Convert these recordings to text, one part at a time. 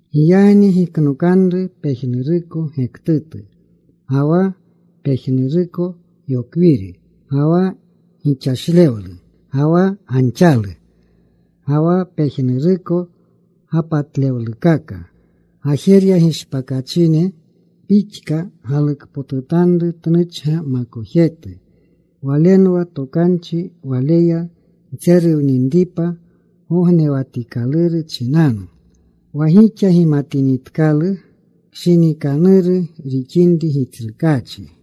Giyagni giknokanru pejnuruko gektutu, ga wa pejnuruko yokwiri, ga wa gixashlewlu, ga wa ganxalu, ga wa pejnuruko gapatlewlukaka. Gajerya gishpakachine pixka galukpotutanru tnuchga makojetu. Walenwa tokanchi. Waleya ntseruwninripa gognewatikaluru chinanu, wa gixa gimatinitkalu kshinikanuru rixinri Gitsrukaachi.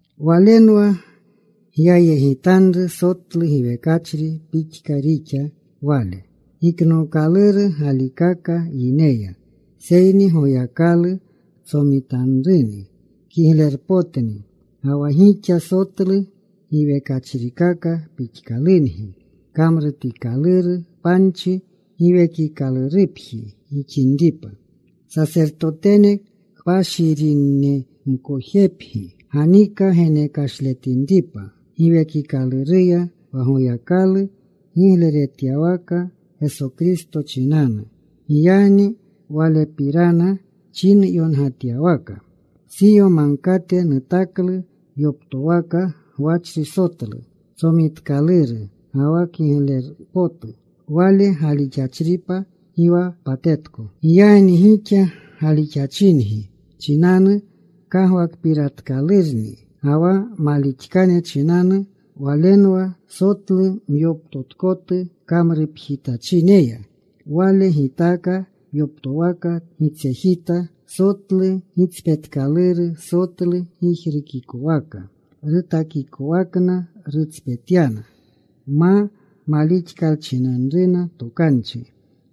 Walenwa gyayegitanru. Sotlu giwekachri pixka rixa Wale, giknookaluru galikaka yineya, seyni Goyakalu tsomitanruni. Kiglepotni. Ga wa gixa sotlu giwekachrikaka pixkalungi kamrutikaluru panchi, Giwekikalurupji gixinripa. Sasertotene kpashirinemkojepgi, ganika genekashletinripa Giwekikaluruya wa Goyakalu gigleretyawaka Geso Kristo chinanu. Giyagni Walepirana chinyongatyawaka: Siyo Magkate nutaklu yoptowaka gwachri sotlu, Tsomitkaluru ga wa kigleru potu. Wale galixachripa gi wa patetko. Giyagni gixa galixachingi chinanu kagwakpiratkalurni. Ga wa malixkane chinanu Walenwa: Wa sotlu myoptotkotu kamrupjitachineya, Wale gitaaka yoptowaka gitsejita. Sotlu gitspetkaluru, sotlu gijrukikwaka. Rutakikowakna rutspetyana ma malixkalchinanruna tokanchi.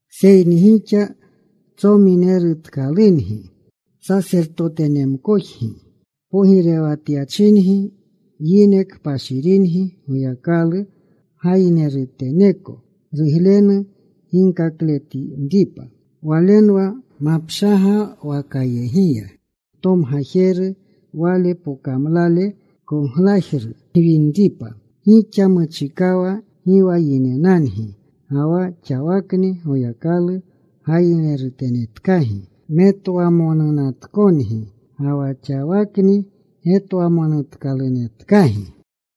Seyni gixa tsominerutkalungi. Sasertotenemkojgi. Pogirewatyachingi. Yine kpashiringi, Goyakalu gayineruteneko, ruglenu ginkakletinripa. Walenwa mapshagwakayegiya ntomgajeru, Wale pokamlale koglajru gwinripa. Gixa muchikawa gi wa yinenangi. Ga wa xawakni Goyakalu gayinerutenetkagi. Metwamonunatkongi, ga wa xawakni getwamonutkalunetkagi.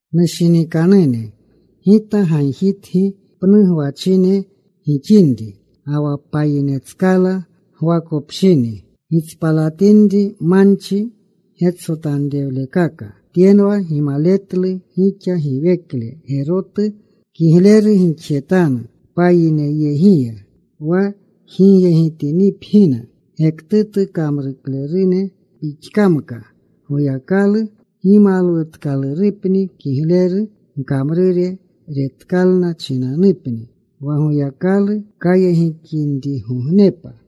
Nushinikanune, gita gagjitgi pnu gwachine gixinri ga wa payinetskala gwakopshini, gitspalatinri manchi getsotanrewlekaka. Tyenwa gimaletlu gixa giwekle gerotu. Kigleru gixjetanu payineyegiya wa jigyegitinipgina gektutu kamruklerune pixkamka, Goyakalu gimalwutkalurupni kigleru gkamrure retkalna chinanupni wa Goyakalu kayegikinrigognepa.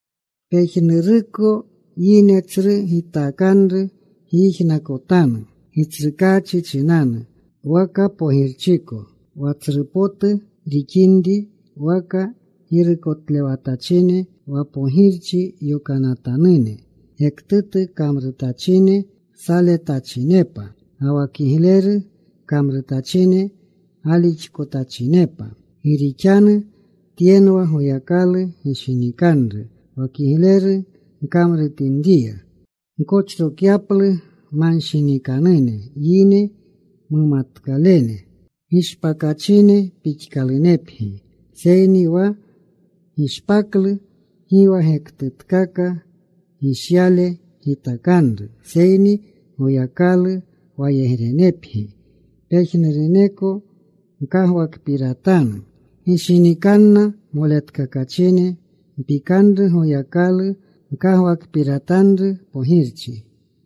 Pejnuruko yine tsru gitakanru gyijnakotanu Gitsrukaachi chinanu, waka pogirchiko, wa tsru potu rixinri, waka girukotlewatachine wa pogirchi yokanatanune gektutu kamrutachine saletachinepa, ga wa kigleru kamrutachine galixkotachinepa. Gi rixanu tyenwa Goyakalu gishinikanru, wa kigleru gkamrutinriya, gkochrokyaplu manshinikanune yine mumatkalene. Gishpakachine pixkalunepgi, seyni wa gishpaklu gi wa gektutkaka gishyale gitakanru. Seyni Goyakalu wayegrenepgi. Pejnuruneko gkagwakpiratanu. Gishinikanna moletkakachine. Mpikanru Goyakalu. Gkagwakpiratanru pogirchi.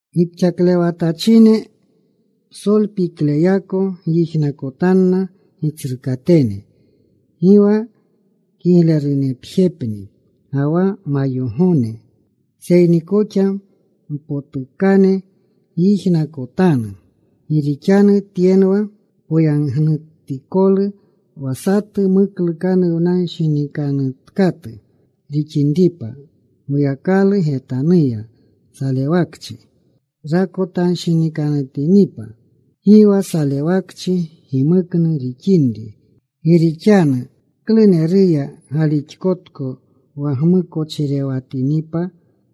Gipxaklewatachine, psolpikleyako gyijnakotanna gitsrukatene. Gi wa kiglerunepjepni ga wa mayogone, seyni koxa mpotukane gyijnakotanu. Gi rixanu tyenwa poyagnutikolu, wa satu muklukanuwnanshinikanutkatu rixinripa Goyakalu getanuya, salewakchi rakotanshinikanutinipa, gi wa salewakchi gimuknu rixinri. Gi rixanu ¿kluneruya galixkotko wa gmukochirewatinipa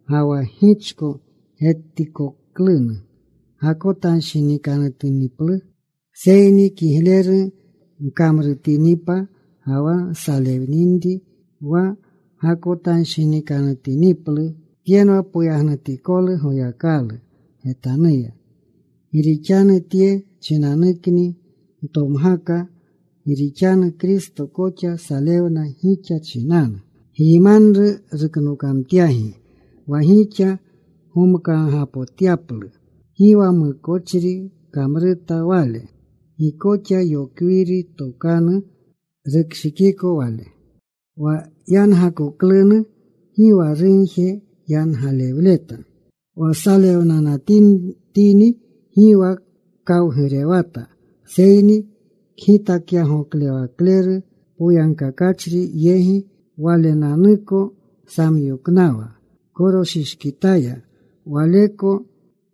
ga wa gichko getikoklunu, gakotanshinikanutiniplu? Seyni kigleru gkamrutinipa ga wa nsalewninri, wa gakotanshinikanutiniplu, tyenwa poyagnutikolu Goyakalu getanuya. Gi rixanu tye chinanukni ntomgaka. Gi rixanu Kristo koxa salewna gixa chinanu. Gyimanru ruknokamtyagi, wa gixa gomkaagapotyaplu. Gi wa mukochri kamruta Wale. Gi koxa yokwiri tokanu rukshikiko Wale. Wa yangakoklunu, gi wa rugje yangalewleta. Wa salewnanatini gi wa kawgurewata. Seyni kgitakyagoklewakleru poyagkakachri yegi Walenanuko samyoknawa. Koroshishkitaya Waleko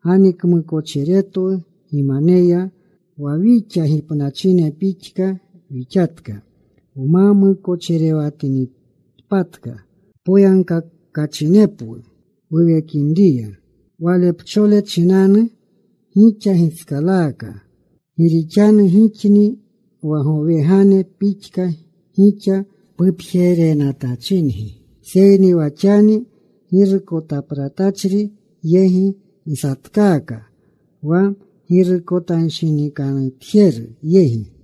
ganikmukochiretwu gimaneya, wa wixa gipnachine pixka wixatka, wma mukochirewatinitpatka, poyagkakachinepwu wuwekinriya. Walepchole chinanu gixa gitskalaaka. Gi rixanu gixni wa gowegane pixka gixa pupjerenatachingi. Seyni wa xani girukotapratachri yegi nsatkaaka, wa girukotanshinikanutjeru yegi.